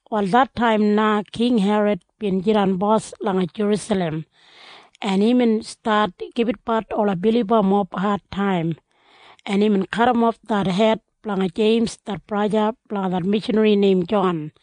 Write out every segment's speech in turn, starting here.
Wal det taim na King Herod bin jidan bos langa Jerusalem, en imbin stat gibitbat ola bilibamob adtaim, en imbin kadimof det hed blanga Jeims det braja blanga det mishanri neim Jon.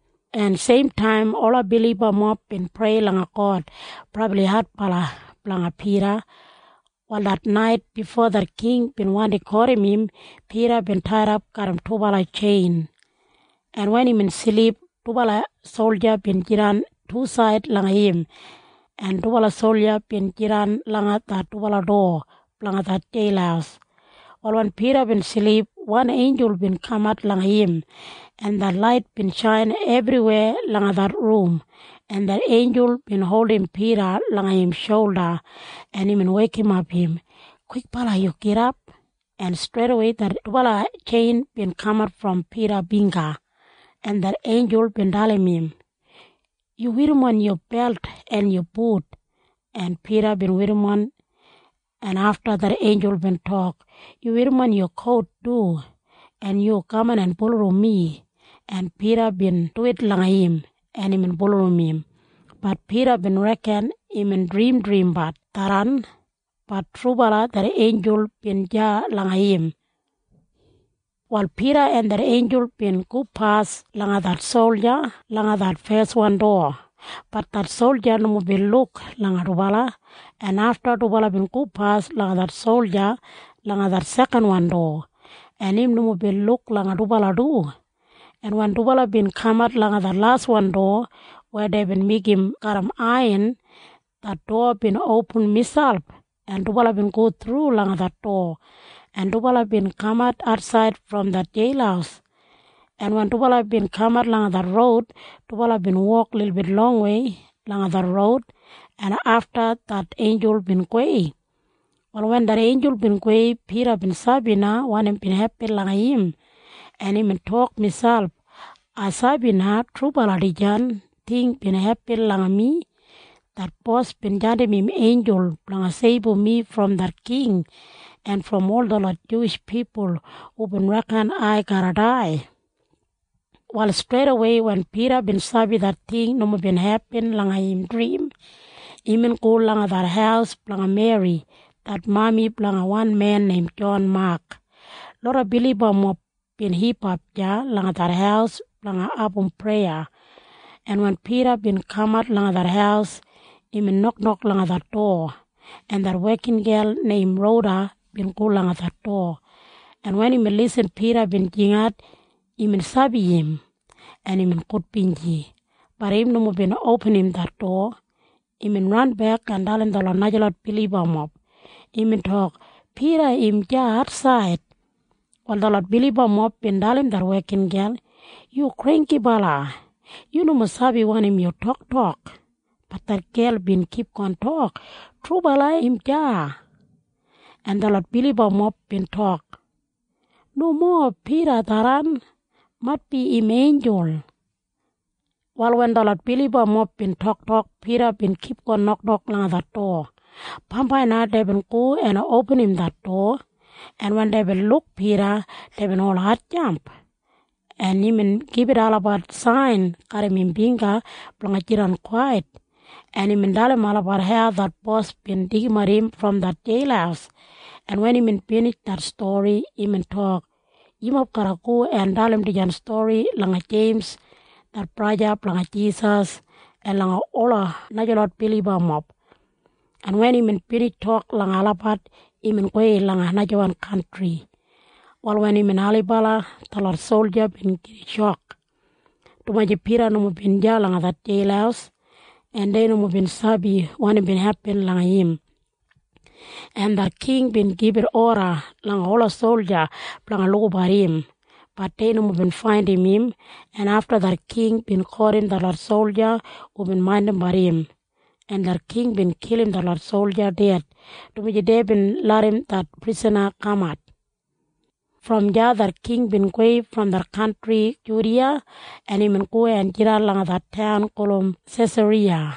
en seimtaim ola bilibamob bin prei langa God brabli adbala blanga Pida. Wal det nait bifo det king bin wandi kotim im, Pida bin taidap garram dubala tjein, en wen imbin silip, dubala solja bin jidan tusaid langa im, en dubala solja bin jidan langa det dubala dowa blanga det jeil. Wal wen Pida bin silip, wan einjul bin kamat langa im, en det lait bin shain ebriweya langa det rum, en det einjul bin holdim Pida langa im sholda, en imbin weikimap im, “Kwikbala yu gidap!” En streidawei det dubala tjein bin kamat brom Pida bingga, en det einjul bin dalim im, “Yu werrimon yu belt en yu but.” En Pida bin werrimon, en afta det einjul bin tok, “Yu werrimon yu kout du, en yu kaman en bulurrum mi.” En Pida bin duwit langa im, en imbin bulurrum im. Bat Pida bin reken imbin drimdrimbat tharran. Bat trubala det einjul bin deya langa im. Wal Pida en det einjul bin gopas langa det solja langa det feswan dowa. Bat det solja nomo bin luk langa dubala, en afta dubala bin gopas langa det solja langa det sekanwan dowa, en im nomo bin luk langa dubala du, en wen dubala bin kamat langa det laswan dowa weya deibin meigim garram aiyan, det dowa bin opin miselp, en dubala bin go thru langa det dowa, en dubala bin kamat atsaid brom det jeil, en wen dubala bin kamat langa det roud, dubala bin wok lilbit longwei langa det roud, en afta det einjul bin gowei. Wal wen det einjul bin gowei, Pida bin sabi na wanim bin hepin langa im, en imbin tok miselp, “Ai sabi na trubala dijan ting bin hepin langa mi. Det Bos bin jandim im einjul blanga seibum mi brom det king en brom ol detlot Juwish pipul hubin reken ai garra dai.” Wal streidawei wen Pida bin sabi det ting nomo bin hepin langa im drim, imbin go langa det haus blanga Meri det mami blanga wan men neim Jon Mak. Loda bilibamob bin hipap deya langa det haus blanga abum preya, en wen Pida bin kamat langa det haus, imbin noknok langa det dowa, en det wekingel neim Roda bin go langa det dowa, en wen imbin lisin Pida bin jingat, imbin sabi im, en imbin gudbinji. Bat im nomo bin opinim det dowa. Imbin ranbek en dalim detlot najalot bilibamob. Imbin tok, “Pida im deya atsaid.” Wal detlot bilibamob bin dalim det wekingel, “Yu granggibala! Yu nomo sabi wanim yu toktok.” Bat det gel bin kipgon tok, “Trubala im deya.” En detlot bilibamob bin tok, “Nomo Pida tharran. Maitbi im einjul.” Wal wen detlot bilibamob bin toktok, Pida bin kipgon noknok langa det dowa. Bambai na deibin go en opinim det dowa, en wen deibin luk Pida, deibin ol hatjamp, en imbin gibit olabat sain garram im bingga blanga jidan kwait, en imbin dalim olabat hau det Bos bin deigimat im brom det jeil, en wen imbin binij det stori, imbin tok, “Yumob garra go en dalim dijan stori langa Jeims det braja blanga Jisas en langa ola najalot bilibamob.” En wen imbin binij tok langa olabat, imbin gowei langa najawan kantri. Wal wen imbin ailibala, detlot solja bin gida shok, dumaji Pida nomo bin deya langa det jeil, en dei nomo bin sabi wanim bin hepin langa im, en det king bin gibit oda langa ola solja blanga lukabat im. Bat dei nomo bin faindim im, en afta det king bin kotim detlot solja hubin maindimbat im, en det king bin kilim detlot solja ded, dumaji deibin larram det prisana kamat. Brom deya det king bin gowei brom det kantri Judiya, en imbin go en jidan langa det taun gulum Sesariya.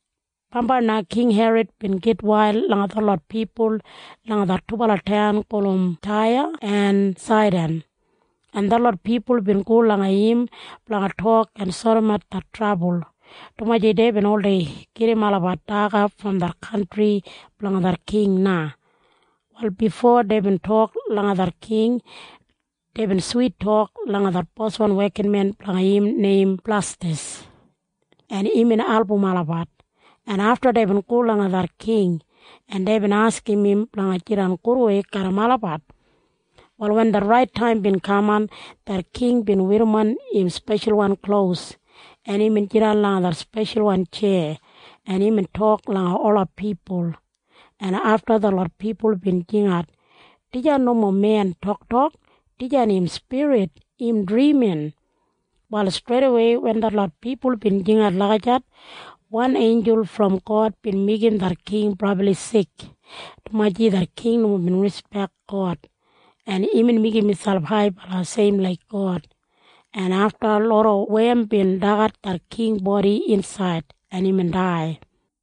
Bambai na King Herod bin gitwail langa detlot pipul langa det dubala taun gulum Taya en Saidan, en detlot pipul bin go langa im blanga tok en sodimat det trabul, dumaji deibin oldei gedim olabat daga brom det kantri blanga det king na. Wal bifo deibin tok langa det king, deibin swit tok langa det boswan wekinmen blanga im neim Blastas, en imbin album olabat, en afta deibin go langa det king, en deibin askim im blanga jidan gudwei garram olabat. Wal wen det rait taim bin kaman, det king bin werrimon im speshalwan klos, en imbin jidan langa det speshalwan tjeya, en imbin tok langa ola pipul, en afta detlot pipul bin jingat, “Dijan nomo men toktok! Dijan im spirit! Im drimin!” Wal streidawei wen detlot pipul bin jingat lagijat, wan einjul brom God bin meigim det king brabli sik, dumaji det king nomo bin rispek God, en imbin meigim miselp haibala seim laik God, en afta loda wem bin dagat det king bodi insaid, en imbin dai.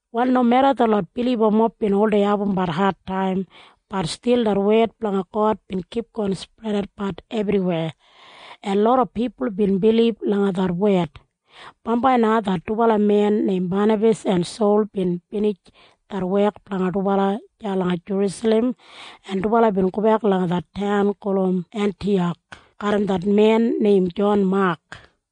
Wal nomeda detlot bilibamob bin oldei abumbat adtaim, bat stil det wed blanga God bin kipgon spredatbat ebriweya, en loda pipul bin bilib langa det wed. Bambai na det dubala men neim Banabas en Sol bin binij det wek blanga dubala deya langa Jerusalem, en dubala bin gobek langa det taun gulum Entiyak garram det men neim Jon Mak.